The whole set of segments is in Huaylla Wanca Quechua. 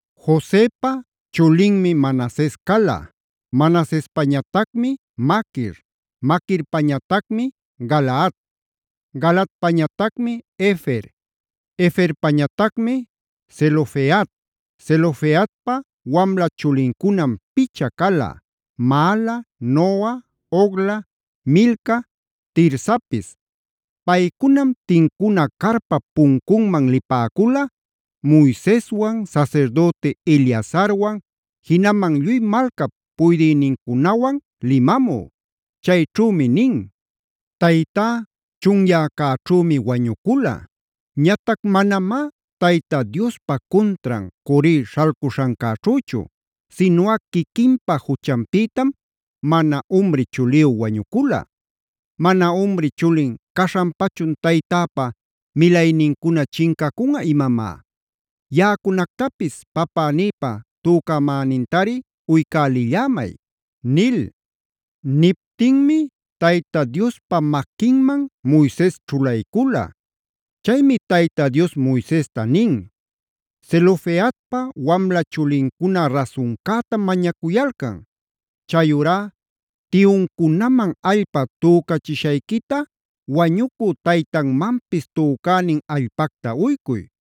Josepa chulinmi Manases cala, Manasespañatacmi Maquir, Maquirpañatacmi Galaad, Galaadpañatacmi Hefer, Heferpañatacmi Zelofehad. Zelofehadpa wamla chulincunam picha cala: Maala, Noa, Hogla, Milca, Tirsapis. Paycunam tincuna carpap puncunman lipäcula Moiseswan, sasirdüti Eleazarwan, jinaman lluy malcap puydïnincunawan limamü. Chayćhümi nin: “Taytá chunyäcäćhümi wañucula. Ñatac manamá Tayta Diospa cuntran Core śhalcuśhancäćhüchu, sinuꞌa quiquinpa juchanpïtam mana umri chuliyü wañucula. ¿Mana umri chulin caśhanpachun taytäpa milaynincuna chincacunꞌa imamá? Yaꞌacunactapis papänïpa tücamänintari uycälillämay” nil. Niptinmi Tayta Diospa maquinman Moises ćhulaycula. Chaymi Tayta Dios Moisesta nin: “Zelofehad wamla chulincuna rasuncätam mañacuyalcan. Chayurá tiyuncunaman allpa tücachishayquita wañucü taytanmanpis tücänin allpacta uycuy.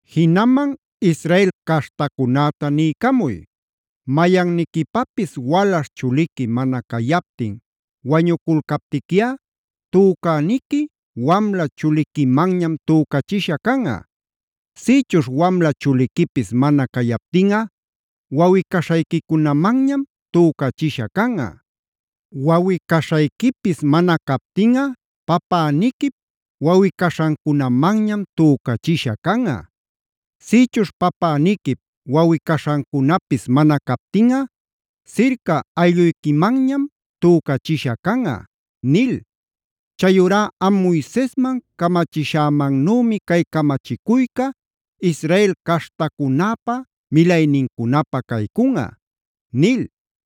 Jinaman Israel caśhtacunäta niycamuy: ‘Mayanniquipapis walaśh chuliqui mana cayaptin wañuculcaptiquiꞌa tücäniqui wamla chuliquimanñam tücachisha canꞌa. Sïchuśh wamla chuliquipis mana cayaptinꞌa wawꞌi-caśhayquicunamanñam tücachisha canꞌa. Wawꞌi-caśhayquipis mana captinꞌa papäniquip wawꞌi-caśhancunamanñam tücachisha canꞌa. Sïchuśh päpäniquip wawꞌi-caśhancunapis mana captinꞌa sirca aylluyquimanñam tücachisha canꞌa’ nil. Chayurá am Moisesman camachishämannümi cay camachicuyca Israel caśhtacunäpa milaynincunapä caycunꞌa” nil.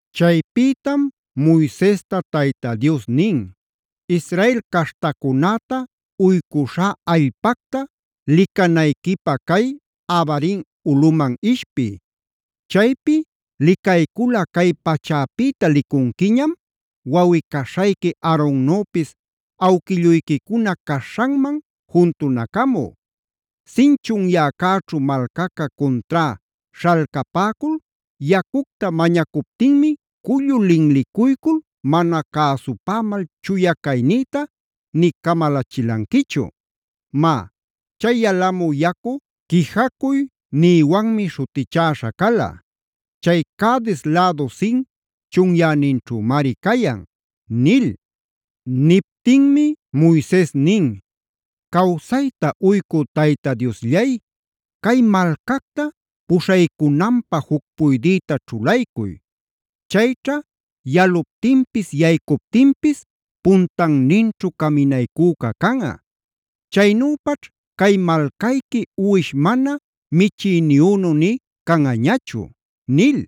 Chaypïtam Moisesta Tayta Dios nin: “Israel caśhtacunäta uycuśhá allpacta licanayquipä cay Abarim ulꞌuman ishpiy. Chaypi licayculꞌa cay pachapïta licunquiñam, wawꞌi-caśhayqui Aaronnüpis awquilluyquicuna caśhanman juntunacamü. Zin chunyäcäćhu malcaca cuntrá śhalcapäcul yacucta mañacuptinmi cullu linlicuycul mana cäsupämal chuya caynïta nï camalachilanquichu. Má, chay yalamü yacu ‘Quijacuy’ nïwanmi śhutichäśha cala; chay Cades lädu Zin chunyäninćhümari cayan”b nil. Niptinmi Moises nin: “Cawsayta uycü Tayta Diosllay cay malcacta puśhaycunanpä juc puydïta ćhulaycuy. Chayćha yaluptinpis yaycuptinpis puntanninćhu caminaycüca canꞌa. Chaynüpaćh cay malcayqui uwish mana michïniyünu nï canꞌañachu”c nil.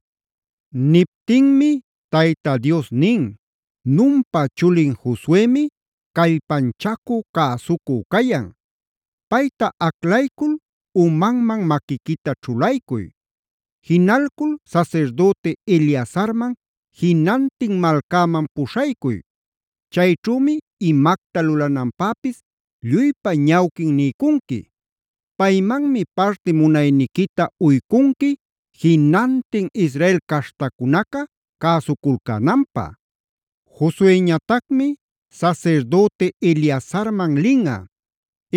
Niptinmi Tayta Dios nin: “Nunpa chulin Josuemid callpanchacü cäsucü cayan. Payta aclaycul umanman maquiquita ćhulaycuy. Jinalcul sasirdüti Eleazarman jinantin malcäman puśhaycuy. Chayćhümi imacta lulananpäpis lluypa ñawquin niycunqui. Paymanmi parti munayniquita uycunqui jinantin Israel caśhtacunaca cäsuculcänanpä.e Josueñatacmi sasirdüti Eleazarman linꞌa;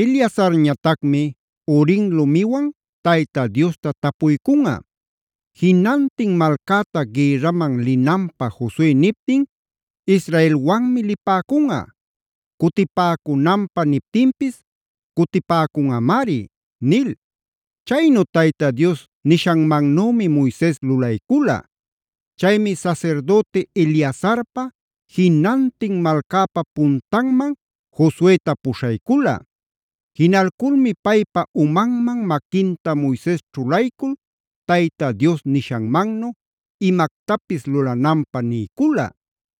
Eleazarñatacmi Urim lumiwanf Tayta Diosta tapuycunꞌa. Jinantin malcäta gïrraman linanpä Josue niptin Israelwanmi lipäcunꞌa; cutipäcunanpä niptinpis cutipäcunꞌamari” nil. Chaynu Tayta Dios nishanmannümi Moises lulaycula. Chaymi sasirdüti Eleazarpa, jinantin malcäpa puntanman Josueta puśhaycula. Jinalculmi paypa umanman maquinta Moises ćhulaycul Tayta Dios nishanmannu imactapis lulananpä niycula.